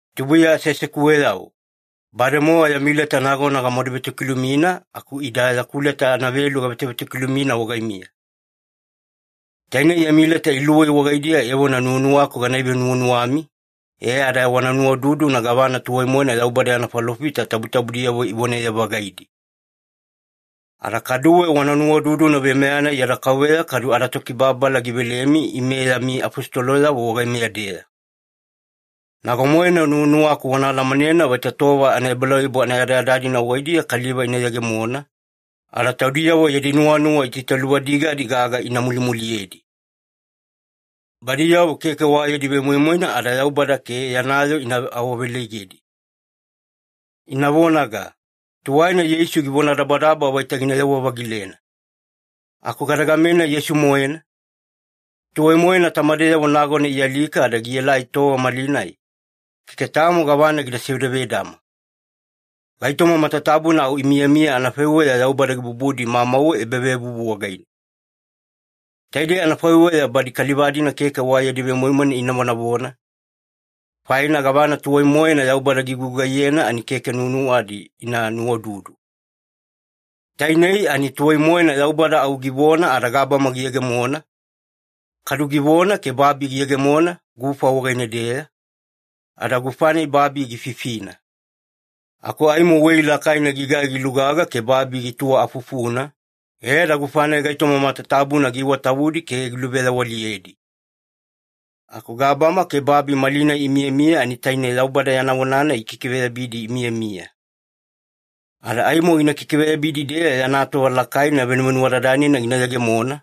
Tubuiya aseasekuweyavo, bademowa yami leta nagona gamaduvetokilumina, aku ida yaku leta anavelu gavetovetokilumina wagaimiya. Taine yami leta iluwei wagaidiya evona nuwanuwaku gana ivenuwanuwami e ada wana nuwaududuna gavana tuwai-moena Yaubada yana falofita tabutabudiyavo ivonaye-vagaidi. Ada kaduwe wana nuwaududuna veimeya-nai yada Kauveya kadu adaTokibababala givelemi ime yami afositoloyavo wagaimeya-deya. Nago-moena nuwanuwaku wana alamanena vaita tova anaebalauyabu anayadayada-dina wagaidiya kaliva ina yegemona, ada taudiyavo yadi nuwanuwa itaitaluvadigadi gaga ina mulimuliyedi. Badiyavo keke wa yadi vemoimoina ada Yaubada ke yana yoo ina awaawaveleigedi. Ina vonaga, “Tuwaina Yeisu givonadabadaba vaita ginayewa-vagilena. Aku gadegamenai Yeisu-moena? Tuwai-moena tamadeyavo nagona ialika ada gielai tova malinai, keke tamo gavana gida sevedavedama. Gaitoma matatabuna au imiyamiya anafaiweya Yaubada gibubudi mauwe ebavevuvu wagaine.” Taidei anafaiweya badi kaliva-dina keke wa yadi vemoimoina ina vonavona, faina gavana tuwai-moena Yaubada gigugaiyena ani keke nuwanuwadi ina nuwaududu. Tainei ani tuwai-moena Yaubada au givona ada gabama giyegemona, kadu givona ke babi giyegemona gufa wagaine-deya, ada gufa-nai babi gififina. Aku aimo wei lakaina gigai gilugaga ke babi gituwa afufuna, e ada gufa-nai gaitoma matatabuna giiwatavudi ke giluveyawaliyedi. Aku gabama ke babi malinai imiyamiya ani taine Yaubada yana vona-nai gikikiveyabidi imiyamiya. Ada aimo gina kikiveyabidi-deeya, yana tova lakaina venuvenuwadadanina gina yegemona,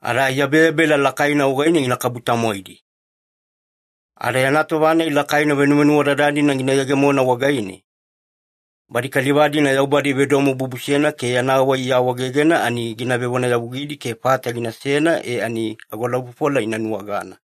ada aiyabeyabela lakaina wagaine ginakabu-tamwaidi. Ada yana tova-nai lakaina venuvenuwadadanina gina yegemona wagaine, badi kaliva-dina Yaubada ivedomobubusena ke yana wai iawaegegena, ani gina vevonayavugidi ke fata ginasena e ani agolaufofola ina nuwagana.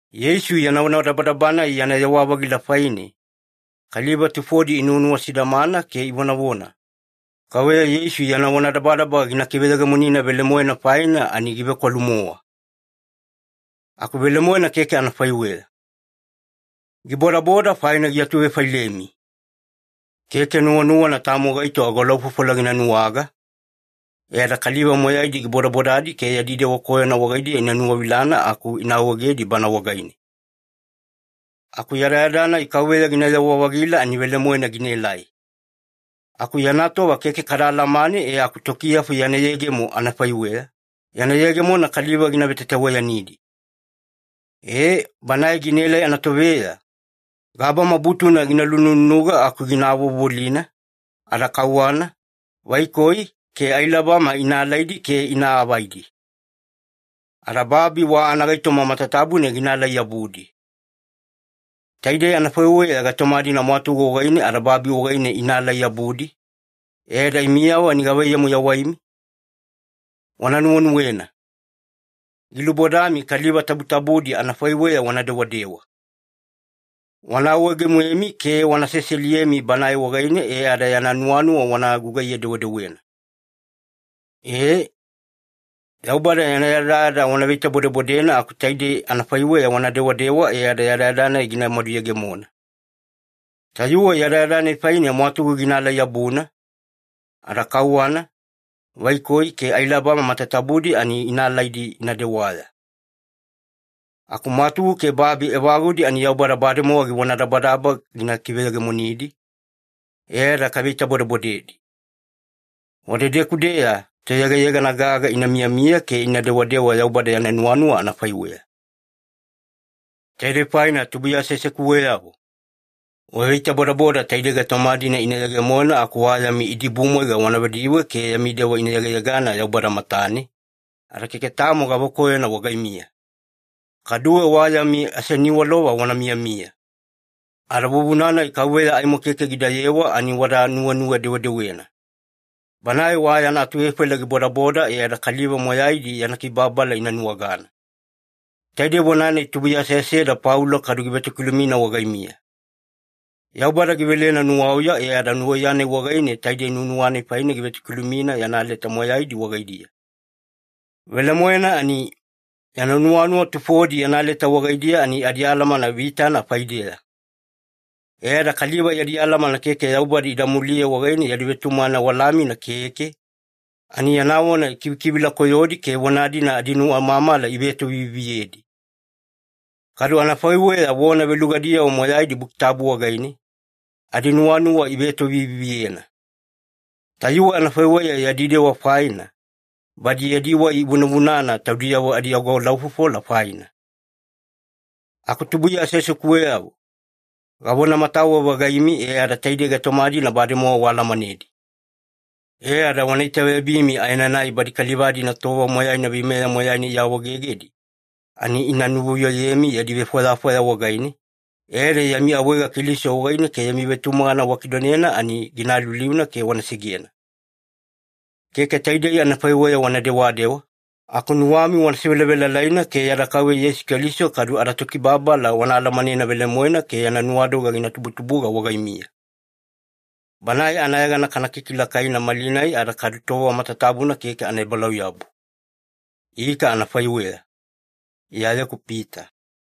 Yeisu yana vonadabadaba-nai yana yewa-vagila faine, kaliva tufodi inuwanuwa sidamana ke ivonavona, “Kauveya Yeisu yana vonadabadaba gina kiveyegemonina velemoena faina ani givekwalu-mowa.” Aku velemoena keke anafaiweya. Gibodaboda faina giatuvefailemi. Keke nuwanuwana tamo gaito agolaufofola gina nuwaga, e ada kaliva moyaidi gibodabodadi ke yadi dewa koyona wagaidiya ina nuwavilana aku ina awaegedi Bana wagaine. Aku yadayada-nai Kauveya ginayewa-vagila ani velemoena ginaelai. Aku yana tova keke kada alamane e aku tokiyafu yana yegemo anafaiweya, yana yegemona kaliva gina vetataweyanidi. E, Banae ginaelai anatoveya, gabama butuna gina lunununuga aku gina avovolina, ada kauwana, vaikoi, ke ailabama ina alaidi ke ina avaidi. Ada babi wa anagaitoma matatabuna ginaalai-yabudi. Taide anafaiweya gaitoma-dina mwatugu wagaine ada babi wagaine inaalai-yabudi, e ada imiyavo ani gavaiyamu yawaimi? Wana nuwenuwena. Gilubodami kaliva tabutabudi anafaiweya wana dewadewa. Wana awaege-moemi ke wana seseliyemi Banae wagaine e ada yana nuwanuwa wana gugaiye-dewedewena. Ee, Yaubada yana yadayada wana veitabodebodena aku taide anafaiweya wana dewadewa e ada yadayada-nai gina maduyegemona. Tayuwe yadayada-nai faine mwatugu ginaalai-yabuna, ada kauwana, vaikoi, ke ailabama matatabudi ani ina alaidi ina dewaya. Aku mwatugu ke babi evagudi ani Yaubada bademowa givonadabadaba gina kiveyegemonidi, e ada kaveitabodebodedi. Wadedeku-deya toyegayegana gaga ina miyamiya ke ina dewadewa Yaubada yana nuwanuwa anafaiweya. Taidei faina tubuiya aseasekuweyavo, waveitabodaboda taidei gaitoma-dina ina yegemona aku wa yami idibumwaiga wana vediwe ke yami dewa ina yegayegana Yaubada matane, ada keke tamo gavakoyona wagaimiya. Kaduwe wa yami aseniwalova wana miyamiya. Ada vuvuna-nai Kauveya aimo keke gidayewa ani wada nuwenuwe-dewedewena. Banae wa yana atuvefaila gibodaboda e ada kaliva moyaidi yana kibababala ina nuwagana. Taidei vona-nai tubuiya aseaseda Paulo kadu givetokilumina wagaimiya. Yaubada givelena nuwauya e ada nuwauya-nai wagaine taide nuwanuwa-nai faine givetokilumina yana leta moyaidi wagaidiya. Velemoena ani, yana nuwanuwa tufodi yana leta wagaidiya ani adialamana vitana faideya. E ada kaliva yadi alamana keke ada Yaubada anamuliya wagaine yadi vetumagana walamina keke, ani yana vona ikivikivila koyodi ke vona-dina adinuwamamala ivetoviviviyedi. Kadu anafaiweya vona velugadiyavo moyaidi Buki Tabu wagaine, adinuwanuwa ivetoviviviyena. Tayuwe anafaiweya yadi dewa faina, badi yadi wai ivunavunana taudiyavo adiagolaufofola faina. Aku tubuiya aseasekuweyavo, gavonamatawe-vagaimi e ada taidei gaitoma-dina bademowa waalamanedi. E ada wana itaveyabimi aenanai badi kaliva-dina tova moyaina veimeya moyaina iawaegegedi, ani ina nuvuyoyemi yadi vefwayafwaya wagaine, e ada yami awaega Keliso wagaine ke yami vetumagana wakidonena ani gina aliuliuna ke wana segena. Keke taidei anafaiweya wana dewadewa, aku nuwami wana sevelavelalaina ke yada Kauveya Yeisu Keliso kadu adaTokibababala wana alamanena velemoena ke yana nuwadoga gina tubutubuga wagaimiya. Banae anayegana kana kikilakaina malinai ada kadu tova matatabuna keke anaebalauyabu. Ika anafaiweya. Iyayeku Pita